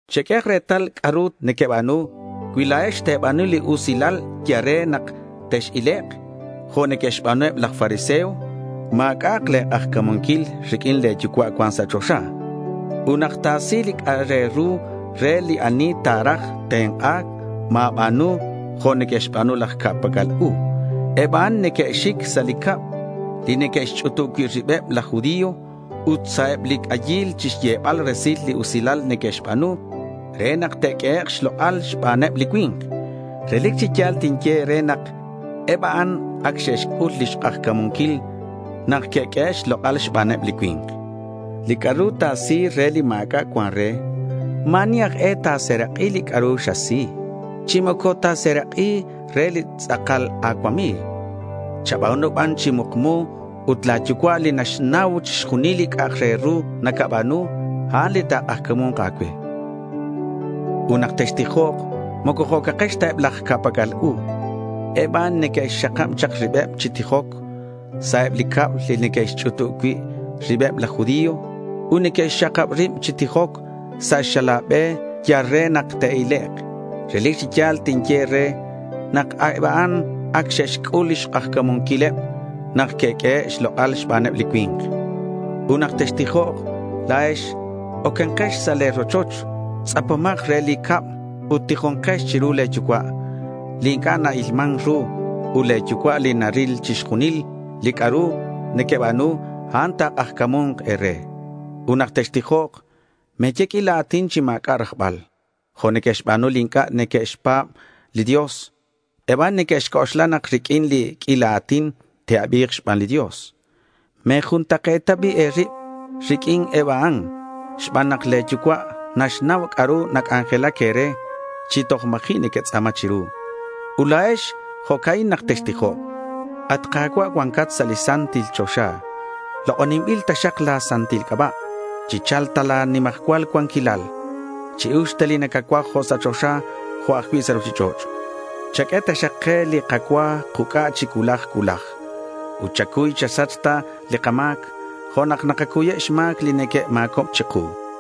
Cheq'uehak retal c'a'ru nequeba̱nu. Cui la̱ex te̱ba̱nu li usilal yal re nak tex-ilek' jo' neque'xba̱nu eb laj fariseo, ma̱c'a'ak le̱ k'ajca̱munquil riq'uin le̱ Yucua' cuan sa' choxa. Ut nak ta̱si li c'a'ak re ru re li ani ta̱raj tenk'a̱c, ma̱ba̱nu jo' neque'xba̱nu laj ca'pac'al u. Eb a'an neque'xic sa' li cab li neque'xch'utub cui' ribeb laj judío ut sa' eb li c'ayil chixyebal resil li usilal neque'xba̱nu re nak te'q'uehek' xlok'al xbaneb li cui̱nk. Relic chi ya̱l tinye e̱re nak eb a'an ac xe'xc'ul lix k'ajca̱munquil nak que'q'uehe' xlok'al xbaneb li cui̱nk. Li c'a'ru ta̱si re li ma̱c'a' cuan re, ma̱ ani aj e ta̱serak'i li c'a'ru xasi, chi moco ta̱serak'i re li tz'akal a̱cuami̱g. Chaba̱nu ban chi mukmu ut la̱ yucua' li naxnau chixjunil li c'a'ak re ru nacaba̱nu, a'an li ta̱k'ajca̱mu̱nk a̱cue. Ut nak textijok moco jo'cakex ta eb laj ca'pac'al u. Eb a'an neque'xxakab chak ribeb chi tijoc sa' eb li cab li neque'xch'utub cui' ribeb laj judío ut neque'xxakab rib chi tijoc sa' xala̱ be yal re nak te'ilek'. Relic chi ya̱l tinye e̱re nak eb a'an ac xe'xc'ul lix k'ajca̱munquileb nak que'q'uehe' xlok'al xbaneb li cui̱nk. Ut nak textijok la̱ex, ocankex sa' le̱ rochoch, tz'apomak re li cab, ut tijonkex chiru le̱ Yucua' li inc'a' na-ilman ru. Ut le̱ Yucua' li naril chixjunil li c'a'ru nequeba̱nu, a'an ta̱k'ajca̱mu̱nk e̱re. Ut nak textijok, me̱ye q'uila a̱tin chi ma̱c'a' rajbal jo' neque'xba̱nu li inc'a' neque'xpa̱b li Dios. Eb a'an neque'xc'oxla nak riq'uin li q'uila a̱tin, te'abi̱k xban li Dios. Me̱juntak'e̱ta bi' e̱rib riq'uin eb a'an xban nak le̱ Yucua' naxnau c'a'ru nac'anjelac e̱re chi toj ma̱ji' nequetz'a̱ma chiru. Ut la̱ex jo'ca'in nak textijok: At Ka̱cua', cuancat sa' li santil choxa, lok'oninbilak taxak la̱ santil c'aba'. Chicha̱lk ta la̱ nimajcual cuanquilal. Chi-uxk ta li nacacuaj, jo' sa' choxa jo' ajcui' sa' ruchich'och'. Chaq'ue taxak ke li kacua kuc'a chi cuulaj cuulaj. Ut chacuy chasach ta li kama̱c jo' nak nakacuyeb xma̱c li neque'ma̱cob chiku.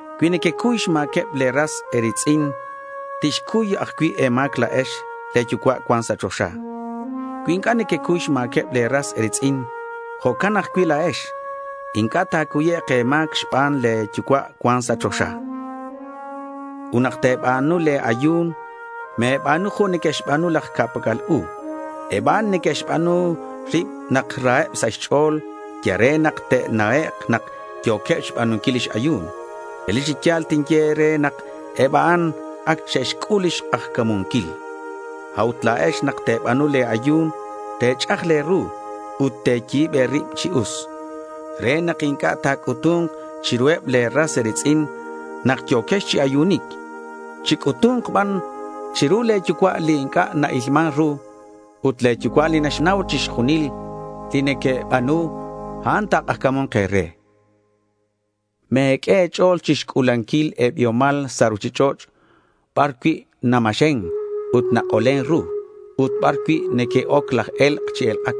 Cui nequecuy xma̱queb le̱ ras e̱ri̱tz'in, tixcuy ajcui' e̱ma̱c la̱ex le̱ Yucua' cuan sa' choxa. Cui inc'a' nequecuy xma̱queb le̱ ras e̱ri̱tz'in, jo'can ajcui' la̱ex inc'a' ta̱cuyek' e̱ma̱c xban le̱ Yucua' cuan sa' choxa. Ut nak te̱ba̱nu le̱ ayu̱n, me̱ba̱nu jo' neque'xba̱nu laj ca'pac'al u. Eb a'an neque'xba̱nu rib nak raheb sa' xch'o̱l yal re nak ta̱na'ek' nak yo̱queb xba̱nunquil lix ayu̱n. Relic chi ya̱l tinye e̱re nak eb a'an ac xe'xc'ul lix k'ajca̱munquil. A'ut la̱ex nak te̱ba̱nu le̱ ayu̱n, te̱ch'aj le̱ ru ut te̱yi̱b e̱rib chi us, re nak inc'a' ta̱c'utu̱nk chiruheb le̱ ras e̱ri̱tz'in nak yo̱quex chi ayunic. Chic'utu̱nk ban chiru le̱ Yucua' li inc'a' na-ilman ru. Ut le̱ Yucua' li naxnau chixjunil li nequeba̱nu, a'an ta̱k'ajca̱mu̱nk e̱re. Me̱q'ue e̱ch'o̱l chixc'u̱lanquil e̱biomal sa' ruchich'och' bar cui' namaxen ut nak'olen ru ut bar cui' neque'oc laj e̱lk' chi elk'ac.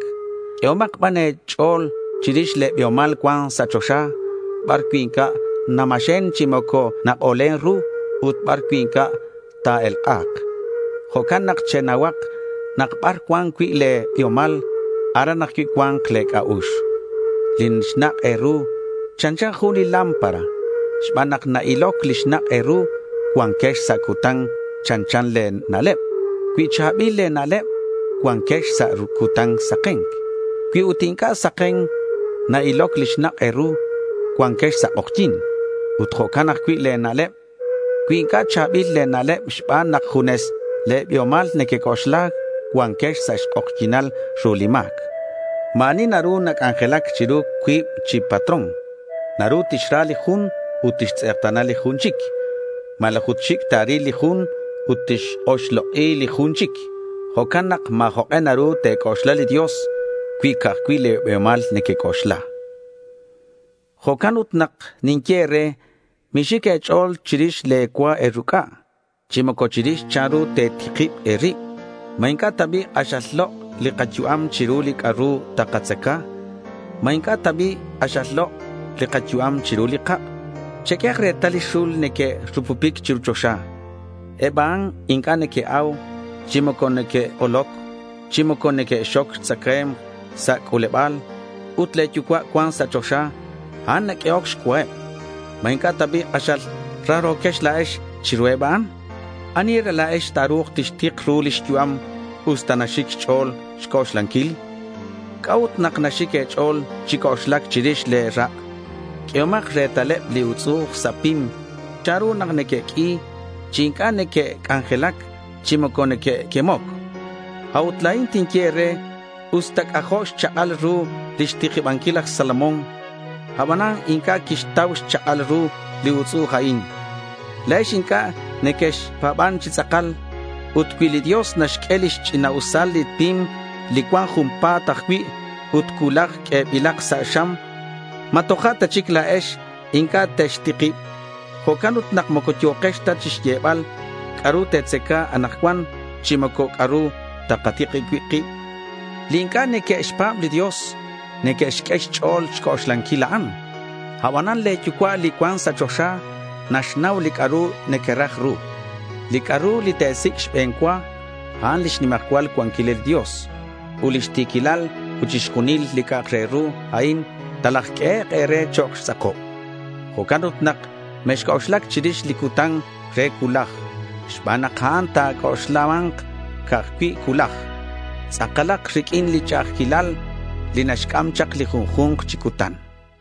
Q'uehomak ban e̱ch'o̱l chirix le̱ biomal cuan sa' choxa bar cui' inc'a' namaxen chi moco nak'olen ru ut bar cui' inc'a' ta̱elk'a̱k. Jo'can nak chenauhak nak bar cuan cui' le̱ biomal, aran ajcui' cua̱nk le̱ c'a'ux. Li xnak' e̱ru chanchan jun li lámpara. Xban nak na-iloc li xnak' e̱ru, cuanquex sa' cutan. Chanchan le̱ na'leb. Cui cha̱bil le̱ na'leb, cuanquex sa' cutan saken. Cui ut inc'a' saken na-iloc li xnak' e̱ru, cuanquex sa' k'ojyi̱n. Ut jo'can ajcui' le̱ na'leb. Cui inc'a' cha̱bil le̱ na'leb xban nak junes le̱ biomal nequec'oxla, cuanquex sa' xk'ojyi̱nal ru li ma̱c. Ma̱ ani naru nac'anjelac chiru cuib chi patrón. Naru tixra li jun ut tixtz'ekta̱na li jun chic malaj ut xic' ta̱ril li jun ut tix-oxlok'i li jun chic. Jo'can nak ma̱ jok'e naru te̱c'oxla li Dios cui ca'aj cui' le̱ biomal nequec'oxla. Jo'can ut nak ninye e̱re: Mixic e̱ch'o̱l chirix le̱ cua e̱ruc'a chi moco chirix chanru te̱tikib e̱rib. ¿Ma inc'a' ta bi' k'axal lok' li kayu'am chiru li c'a'ru takatzaca? ¿Ma inc'a' ta bi' k'axal lok' li kayu'am chiru li kak'? Cheq'uehak retal li xul li neque'rupupic chiru choxa. Eb a'an inc'a' neque'au, chi moco neque'k'oloc chi moco neque'xxoc xtzacae̱mk sa' c'u̱leba̱l. Ut le̱ Yucua' cuan sa' choxa, a'an naq'uehoc xcuaheb. ¿Ma inc'a' ta bi' k'axal raro̱quex la̱ex chiruheb a'an? ¿Ani e̱re la̱ex ta̱ru̱k tixtik ru lix yu'am usta naxic xch'o̱l xc'oxlanquil? ¿C'a'ut nak naxic e̱ch'o̱l chi c'oxlac chirix le̱ rak'? Q'uehomak retaleb li utz'u'uj sa' pim chanru nak neque'q'ui chi inc'a' neque'c'anjelac chi moco neque'quemoc. A'ut la̱in tinye e̱re, usta c'ajo' xchak'al ru lix tikibanquil laj Salomón, abanan inc'a' quixtau xchak'al ru li utz'u'uj a'in. La̱ex inc'a' nequexpa̱ban chi tz'akal. Ut cui li Dios naxq'ue lix ch'ina'usal li pim li cuan junpa̱t ajcui' ut cuulaj q'uebilak sa' xam, ¿ma toja' ta chic la̱ex inc'a' textikib? Jo'can ut nak moco yo̱kex ta chixyebal: ¿C'a'ru takatzaca anakcuan? chi moco, ¿c'a'ru takatikib cui' kib? Li inc'a' neque'xpa̱b li Dios neque'xq'ue xch'o̱l xc'oxlanquil a'an. Abanan le̱ Yucua' li cuan sa' choxa naxnau li c'a'ru nequeraj ru. Li c'a'ru li te̱sic' xbe̱n cua, a'an lix nimajcual cuanquilal li Dios ut lix ti̱quilal, ut chixjunil li c'a'ak re ru a'in talajq'uehek' e̱re chok' xtz'akob. Jo'can ut nak mexc'oxlac chirix li cutan re cuulaj xban nak a'an ta̱c'oxlama̱nk ajcui' cuulaj. Tz'akalak riq'uin li ch'a'ajquilal li naxc'am chak li junju̱nk chi cutan.